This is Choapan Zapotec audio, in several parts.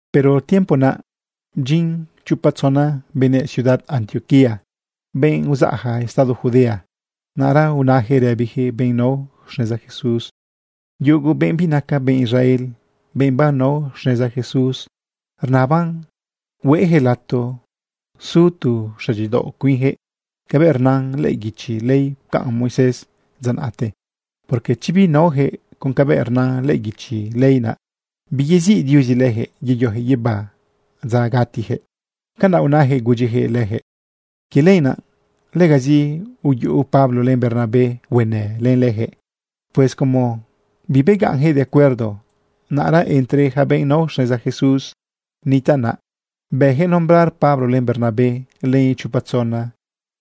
Pero tiempo naꞌ bdyin chopa tzona benëꞌ ciudad Antioquía, benꞌ uzaꞌja estado Judea. Naꞌra unayaquëꞌ rëbiyaquëꞌ benꞌ nao xneza Jesús: ―Yugu benꞌ binaca benꞌ Israel, benꞌ banao xneza Jesús, rnaban hueyaquëꞌ lato su tu xëdyidaoꞌ cuinyaquëꞌ cabëꞌ rna lëꞌë guichi ley pcaꞌn Moisés dza naꞌte. Porque chi binaoyaquëꞌ con cabëꞌ rna lëꞌë guichi ley naꞌ, biyeziꞌ Diuzi leyaquëꞌ yeyoyaquëꞌ guibá dza gatiyaquëꞌ. ―Canaꞌ unayaquëꞌ gudyijëꞌ lejëꞌ. Quie lenaꞌ legazi uyuꞌu Pablo len Bernabé huenë len leyaquëꞌ. Pues como bibegaꞌnjëꞌ de acuerdo, naꞌra entre yaca benꞌ nao xneza Jesús nitaꞌ naꞌ, bëyaquëꞌ nombrar Pablo len Bernabé len ichopa tzona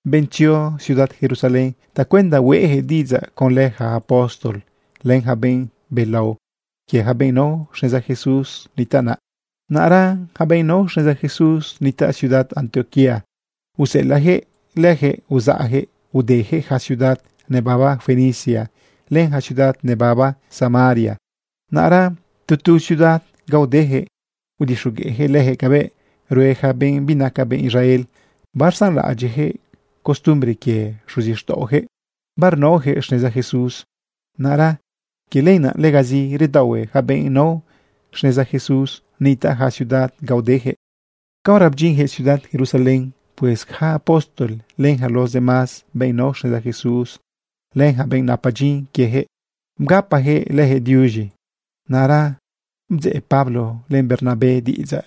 benꞌ tzio ciudad Jerusalén tacuenda hueꞌjëꞌ diꞌidzaꞌ conlë ja apóstol len yaca benꞌ belao quie yaca benꞌ nao xneza Jesús nitaꞌ naꞌ. Naꞌra yaca benꞌ nao xneza Jesús nitaꞌ ciudad Antioquía useꞌelaꞌyaquëꞌ lejëꞌ uzaꞌyaquëꞌ udeyaquëꞌ ja ciudad nebaba Fenicia len ja ciudad nebaba Samaria. Naꞌra tu tu ciudad ga udeyaquëꞌ udixogueꞌyaquëꞌ leyaquëꞌ cabëꞌ rue yaca benꞌ binaca benꞌ Israel barsanlaꞌadyiꞌyaquëꞌ costumbre quie xuzixtaꞌoyaquëꞌ, barnaoyaquëꞌ xneza Jesús. Naꞌra quie lenaꞌ, legazi redaohue yaca benꞌ nao xneza Jesús nitaꞌ ja ciudad ga udeyaquëꞌ. Caora bedyinyaquëꞌ ciudad Jerusalén, pues yaca apóstol, len yaca los demás benꞌ nao xneza Jesús, len yaca benꞌ napa dyin quieyaquëꞌ, bgapajëꞌ leyaquëꞌ diuz̃i. Naꞌra bdzeꞌ Pablo len Bernabé diꞌidzaꞌ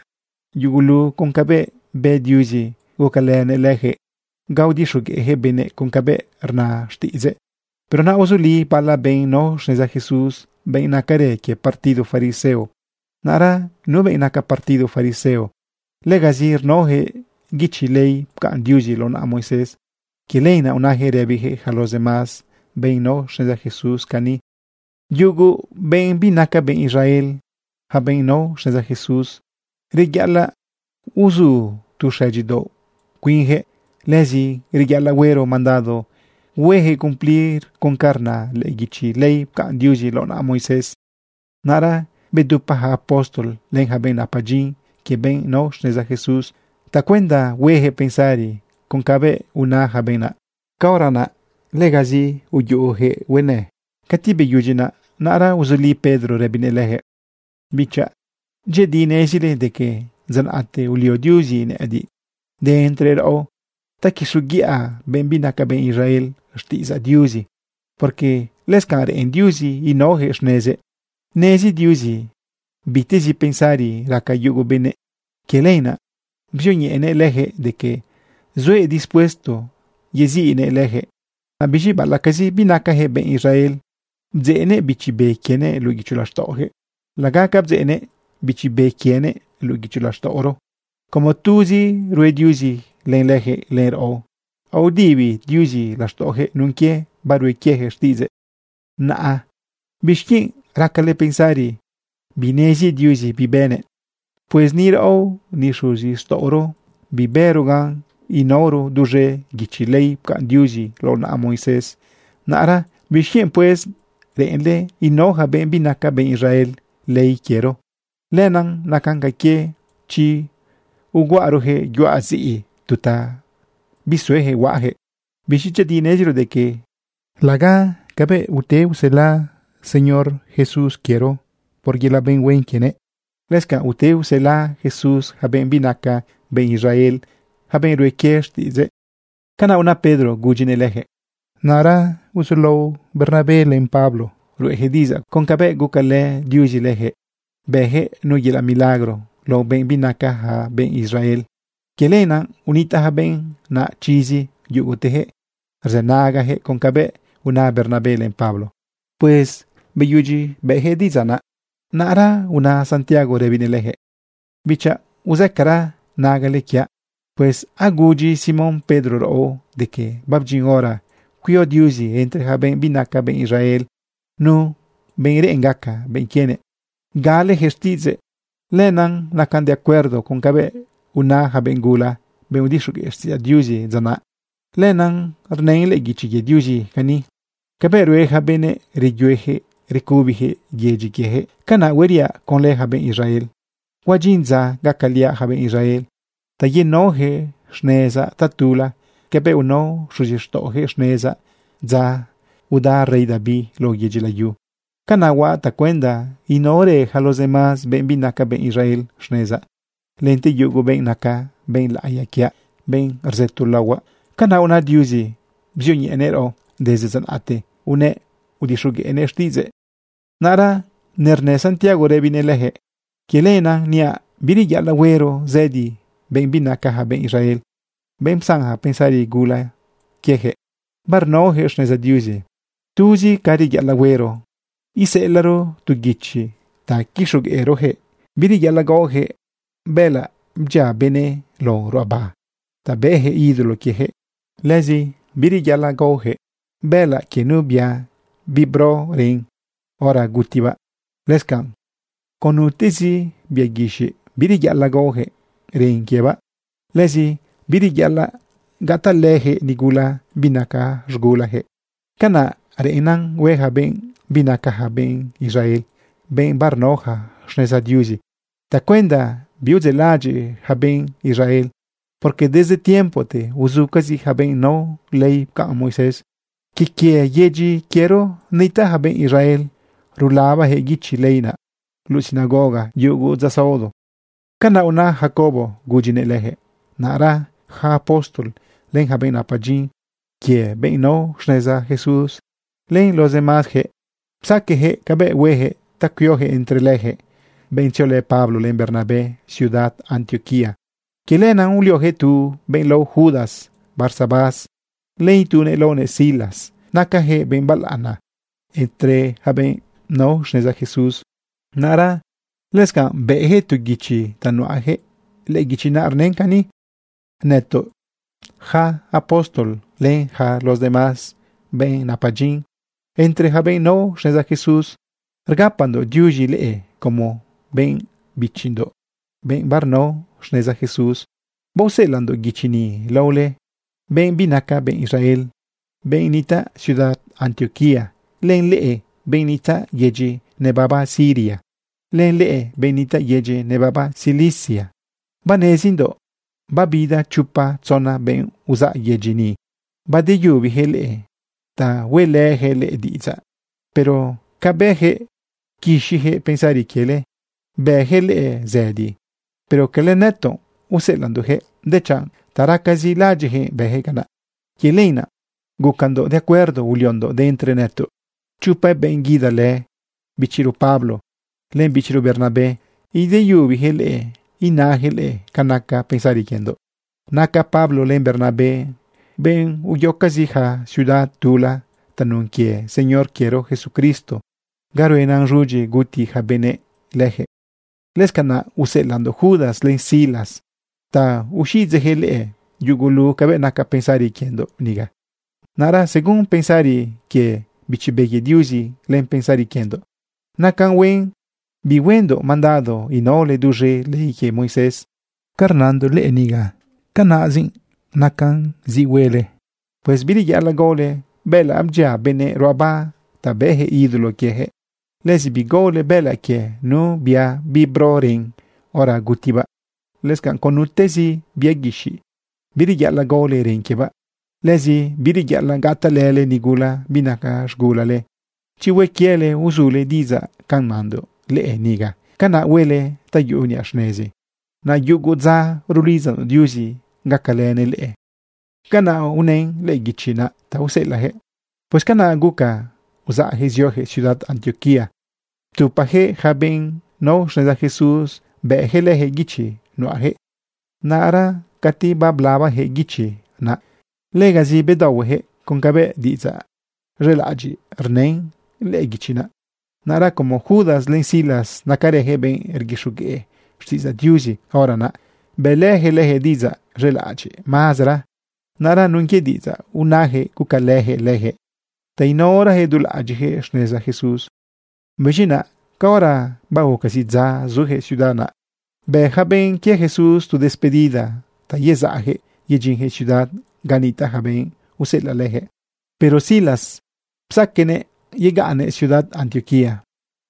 yugulu con cabëꞌ bë Diuzi gucalënëꞌ leyaquëꞌ ga udixogueꞌjëꞌ benëꞌ con cabëꞌ rna xtiꞌidzëꞌ. Pero naꞌ uzuli bala benꞌ nao xneza Jesús, benꞌ nacarë quie partido fariseo. Naꞌra nu benꞌ naca partido fariseo, legazi rnaoyaquëꞌ guichi ley pcaꞌn Diuzi lao naꞌa Moisés. Quie lenaꞌ unayaquëꞌ rëbiyaquëꞌ yaca los demás benꞌ nao xneza Jesús cani: ―Yugu benꞌ binaca benꞌ Israel, yaca benꞌ nao xneza Jesús, reyaꞌalaꞌ uzu tu xëdyidaoꞌ cuinyaquëꞌ. Lëzi reyaꞌalaꞌ huero mandado huejëꞌ cumplir con ca rna lëꞌë guichi ley pcaꞌn Diuzi lao naꞌa Moisés. Naꞌra bedupa yaca apóstol len yaca benꞌ napa dyin quie benꞌ nao xneza Jesús tacuenda hueyaquëꞌ pensari con cabëꞌ una yaca benꞌ naꞌ. Caora naꞌ legazi uyuꞌuyaquëꞌ huenë. Cati beyudyi naꞌ, naꞌra uzuli Pedro rëbinëꞌ leyaquëꞌ: ―Bichaꞌ, dyëꞌëdi nezile de que dza naꞌte ulio Diuzi nëꞌëdiꞌ de entre raꞌo ta quixoguiꞌa benꞌ binaca benꞌ Israel xtiꞌidzaꞌ Diuzi, porque lëscanꞌ reꞌen Diuzi inaoyaquëꞌ xnezëꞌ. Nezi Diuzi bitezi pensari raca yugo benëꞌ. Quie lenaꞌ bzioñeꞌenëꞌ leyaquëꞌ de que zuëꞌ dispuesto yeziꞌnëꞌ leyaquëꞌ. Naꞌ biz̃i baꞌalaꞌcazi binacajëꞌ benꞌ Israel, bdzeꞌnëꞌ Bichi Be quienëꞌ luꞌu guicho laxtaꞌoyaquëꞌ laga ca bdzeꞌnëꞌ Bichi Be quienëꞌ luꞌu guicho laxtaꞌoro. Como tuzi rue Diuzi len leyaquëꞌ len raꞌo, aodibi Diuzi laxtaꞌoyaquëꞌ nun quie barue quieyaquëꞌ xtiꞌidzëꞌ. Naꞌa ¿bixquienꞌ racale pensari binezi Diuzi bi bënëꞌ? Pues ni raꞌo ni xuzixtaꞌoro bibëro gan inaoro duz̃e guichi ley pcaꞌn Diuzi lao naꞌa Moisés. Naꞌra ¿bixquienꞌ, pues, reꞌenle inao yaca benꞌ binaca benꞌ Israel ley quiero? Lenaꞌ nacan ca quie chi uguaꞌaroyaquëꞌ yuaꞌ ziꞌi, tu ta bisuejëꞌ huaꞌayaquëꞌ. Biz̃i dyëꞌëdi neziro de que laga cabëꞌ ute usela Señor Jesús quiero por yelaꞌ benꞌ huen quienëꞌ, lëscanꞌ ute usela Jesús yaca benꞌ binaca benꞌ Israel, yaca benꞌ rue quie xtiꞌidzëꞌ. ―Canaꞌ una Pedro gudyinëꞌ leyaquëꞌ. Naꞌra uzulao Bernabé len Pablo ruꞌeyaquëꞌ diꞌidzaꞌ con cabëꞌ gucalë Diuzi leyaquëꞌ bëyaquëꞌ nu yelaꞌ milagro lao benꞌ binacaja benꞌ Israel. Quie lenaꞌ unitaꞌ yaca benꞌ naꞌ chizi yugutejëꞌ rzënagayaquëꞌ con cabëꞌ una Bernabé len Pablo. Pues beyudyi bëꞌyaquëꞌ diꞌidzaꞌ naꞌ, naꞌra una Santiago rëbinëꞌ leyaquëꞌ: ―Bichaꞌ, uzëcara nagale quiaꞌ. Pues agudyi Simón Pedro raꞌo de que babdyin hora cuio Diuzi entre ja benꞌ binaca benꞌ Israel nu benꞌ reꞌen gaca benꞌ quienëꞌ galeyaquëꞌ xtiꞌidzëꞌ. Lenaꞌ nacan de acuerdo con cabëꞌ una ja benꞌ gula, benꞌ udixogueꞌ xtiꞌidzaꞌ Diuzi dza naꞌ. Lenaꞌ rnën lëꞌë guichi quie Diuzi cani: Cabëꞌ rue yaca benëꞌ, reyueyaquëꞌ recubiyaquëꞌ yedyi quieyaquëꞌ, canaꞌ hueriaꞌ conlë yaca benꞌ Israel. Huadyin dza gacaliaꞌ yaca benꞌ Israel ta yenaoyaquëꞌ xnezaꞌ tatula cabëꞌ unao xuzixtaꞌoyaquëꞌ xnezaꞌ dza uda rey David lao yedyi layu. Canaꞌ huaꞌ tacuenda inaorë yaca los demás benꞌ binaca benꞌ Israel xnezaꞌ, lente yugu benꞌ naca benꞌ laꞌiya quiaꞌ, benꞌ rzëto laohuaꞌ. Canaꞌ una Diuzi bzioñeꞌenëꞌ raꞌo. Desde dza naꞌte unëꞌ udixogueꞌnëꞌ xtiꞌidzëꞌ. Naꞌra nernë Santiago rëbinëꞌ leyaquëꞌ: ―Quie lenaꞌ niaꞌ bireyaꞌalaꞌ huero zëdi benꞌ binacaja benꞌ Israel, benꞌ psanja pensari gula quiejëꞌ barnaojëꞌ xneza Diuzi. Tuzi ca reyaꞌalaꞌ huero iseꞌelaꞌro tu guichi ta quixogueꞌroyaquëꞌ bireyaꞌalaꞌ gaoyaquëꞌ bëꞌëlaꞌ bdyia benëꞌ lao ruꞌaba ta bëꞌyaquëꞌ ídolo quieyaquëꞌ. Lëzi bireyaꞌalaꞌ gaoyaquëꞌ bëꞌëlaꞌ quie nu bia bibro ren hora gutibaꞌ. Lëscanꞌ, con nutezi bia guixiꞌ, bireyaꞌalaꞌ gaoyaquëꞌ ren quiebaꞌ. Lëzi bireyaꞌalaꞌ gatalëyaquëꞌ nigula binaca z̃gulayaquëꞌ. Canaꞌ reꞌennan hueja benꞌ binacaja benꞌ Israel, benꞌ barnaoja xneza Diuzi tacuenda biudzeꞌlaꞌadyiꞌ ja benꞌ Israel, porque desde tiempote uzucazi ja benꞌ nao ley pcaꞌn Moisés. Quie quie yedyi quiero nitaꞌ yaca benꞌ Israel rulabajëꞌ guichi ley naꞌ luꞌu sinagoga yugu dza saodo. ―Canaꞌ una Jacobo gudyinëꞌ leyaquëꞌ. Naꞌra ja apóstol, len yaca benꞌ napa dyin quie benꞌ nao xneza Jesús, len los demásyaquëꞌ, psaqueꞌyaquëꞌ cabëꞌ huejëꞌ ta cuioyaquëꞌ entre leyaquëꞌ benꞌ tziolë Pablo len Bernabé ciudad Antioquía. Quie lenaꞌ ulioyaquëꞌ tu benꞌ lao Judas Barsabás, len itunëꞌ laonëꞌ Silas. Nacayaquëꞌ benꞌ balaꞌana entre ja benꞌ nao xneza Jesús. Naꞌra lëscanꞌ bëyaquëꞌ tu guichi ta nuꞌayaquëꞌ. Lëꞌë guichi naꞌ rnën cani: “Nëtoꞌ, yaca apóstol len yaca los demás benꞌ napa dyin entre yaca benꞌ nao xneza Jesús, rgapandoꞌ diuz̃i leꞌe como benꞌ bichindoꞌ, benꞌ barnao xneza Jesús. Baoseꞌelaꞌndoꞌ guichi ni lao leꞌe benꞌ binaca benꞌ Israel, benꞌ nitaꞌ ciudad Antioquía, len leꞌe benꞌ nitaꞌ yedyi nebaba Siria, len leꞌe benꞌ nitaꞌ yedyi nebaba Cilicia. Banezindoꞌ babida chopa tzona benꞌ uzaꞌ yedyi ni badeyubiyaquëꞌ leꞌe ta hueꞌlëyaquëꞌ leꞌe diꞌidzaꞌ, pero ca bëyaquëꞌ pquixiyaquëꞌ pensari quiele bëyaquëꞌ leꞌe zëdi. Pero cala nëtoꞌ useꞌelaꞌndoꞌyaquëꞌ, dechanꞌ ta racazi laꞌadyiꞌjëꞌ bëjëꞌ canaꞌ. Quie lenaꞌ gucandoꞌ de acuerdo, uliondoꞌ de entre nëtoꞌ chopa benꞌ guidalë bichiro Pablo len bichiro Bernabé ideyubiyaquëꞌ leꞌe inayaquëꞌ leꞌe ca naca pensari quiendoꞌ. Naca Pablo len Bernabé benꞌ uyocazi ja ciudad tula tanun quie Señor quiero Jesucristo ga ruenan z̃udyi guti ja benëꞌ lejëꞌ. Lëscanaꞌ useꞌelaꞌndoꞌ Judas len Silas ta uxiꞌidzeꞌyaquëꞌ leꞌe yugulu cabëꞌ naca pensari quiendoꞌ niga. Naꞌra según pensari quie Bichi Be quie Diuzi len pensari quiendoꞌ, nacan huen bihuendoꞌ mandado inaole duz̃e ley quie Moisés. Ca rnandoꞌ leꞌe niga, canaꞌzi nacan zi quiele huele. Pues bireyaꞌalaꞌ gaole bëꞌëlaꞌ bdyia benëꞌ ruꞌaba ta bëꞌyaquëꞌ ídolo quieyaquëꞌ. Lëzi bigaole bëꞌëlaꞌ quie nu bia bibro ren hora gutibaꞌ. Lëscanꞌ con nutezi bia guixiꞌ, bireyaꞌalaꞌ gaole ren quiebaꞌ. Lëzi bireyaꞌalaꞌ gatalële nigula binaca z̃gulale. Chi hue quiele uzule diꞌidzaꞌ ca nandoꞌ leꞌe niga, canaꞌ huele ta yuꞌu niꞌa xnezi. Naꞌ yugu dza rulidzandoꞌ Diuzi gacalënëꞌ leꞌe.” Canaꞌ unën lëꞌë guichi naꞌ ta useꞌelaꞌyaquëꞌ. Pues canaꞌ guca uzaꞌyaquëꞌ zioyaquëꞌ ciudad Antioquía ptupayaquëꞌ yaca benꞌ nao xneza Jesús, bëꞌyaquëꞌ leyaquëꞌ guichi nuꞌayaquëꞌ. Naꞌra cati bablabayaquëꞌ guichi naꞌ, legazi bedaohueyaquëꞌ con cabëꞌ diꞌidzaꞌ z̃elaꞌadyiꞌ rnën lëꞌë guichi naꞌ. Naꞌra como Judas len Silas nacarëyaquëꞌ benꞌ rguixogueꞌ xtiꞌidzaꞌ Diuzi, hora naꞌ bëꞌlëyaquëꞌ leyaquëꞌ diꞌidzaꞌ z̃elaꞌadyiꞌ mazera. Naꞌra nun quie diꞌidzaꞌ unayaquëꞌ gucalëyaquëꞌ leyaquëꞌ ta inaorayaquëꞌ dulaꞌadyiꞌjëꞌ xneza Jesús. Biz̃i naꞌ caora baguca zidza zuyaquëꞌ ciudad naꞌ, bë yaca benꞌ quie Jesús tu despedida ta yezaꞌyaquëꞌ yedyinyaquëꞌ ciudad ga nitaꞌ ja benꞌ useꞌelaꞌ leyaquëꞌ. Pero Silas psaqueꞌnëꞌ yegaꞌnnëꞌ ciudad Antioquía.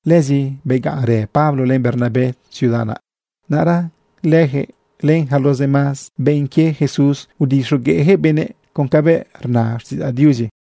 Lëzi begaꞌnrë Pablo len Bernabé ciudad naꞌ. Naꞌra leyaquëꞌ len yaca los demás benꞌ quie Jesús, udixogueꞌyaquëꞌ benëꞌ con cabëꞌ rna xtiꞌidzaꞌ Diuzi.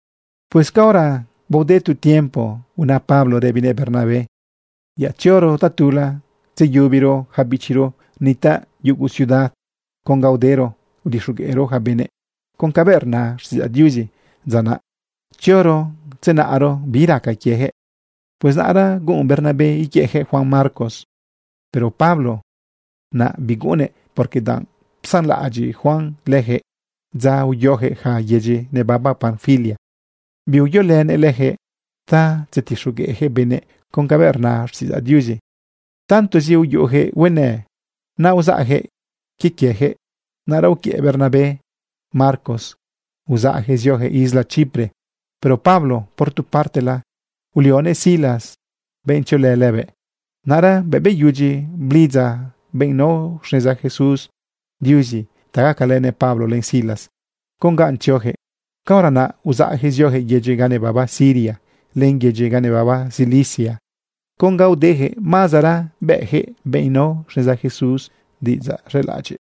Pues caora baode tu tiempo, una Pablo rëbinëꞌ Bernabé: ―Yaꞌ tzioro tatula tzeyubiro ja bichiro nitaꞌ yugu ciudad con ga udero udixogueꞌro yaca benëꞌ con cabëꞌ rna xtiꞌidzaꞌ Diuzi dza naꞌ. Tzioro tzenaꞌro bi raca quiejëꞌ. Pues naꞌra guꞌun Bernabé iquiëꞌyaquëꞌ Juan Marcos, pero Pablo naꞌ biguꞌunnëꞌ, porque danꞌ psanlaꞌadyiꞌ Juan leyaquëꞌ dza uyoyaquëꞌ yaca yedyi nebaba Panfilia. Biuyolënëꞌ leyaquëꞌ ta tzetixogueꞌyaquëꞌ benëꞌ con cabëꞌ rna xtiꞌidzaꞌ Diuzi. Tantozi uyuꞌuyaquëꞌ huenë naꞌ, uzaꞌyaquëꞌ quie quieyaquëꞌ. Naꞌra uquiëꞌ Bernabé Marcos uzaꞌyaquëꞌ zioyaquëꞌ isla Chipre. Pero Pablo, por tu partela, ulionëꞌ Silas benꞌ tziolë lëbëꞌ. Naꞌra bëꞌ beyudyi blidza benꞌ nao xneza Jesús Diuzi ta gacalënëꞌ Pablo len Silas con ga tzioyaquëꞌ, caora naꞌ uzaꞌyaquëꞌ zioyaquëꞌ yedyi ga nebaba Siria len yedyi ga nebaba Cilicia. Con ga udeyaquëꞌ mazera bëꞌyaquëꞌ benꞌ nao xneza Jesús diꞌidzaꞌ z̃elaꞌadyiꞌ.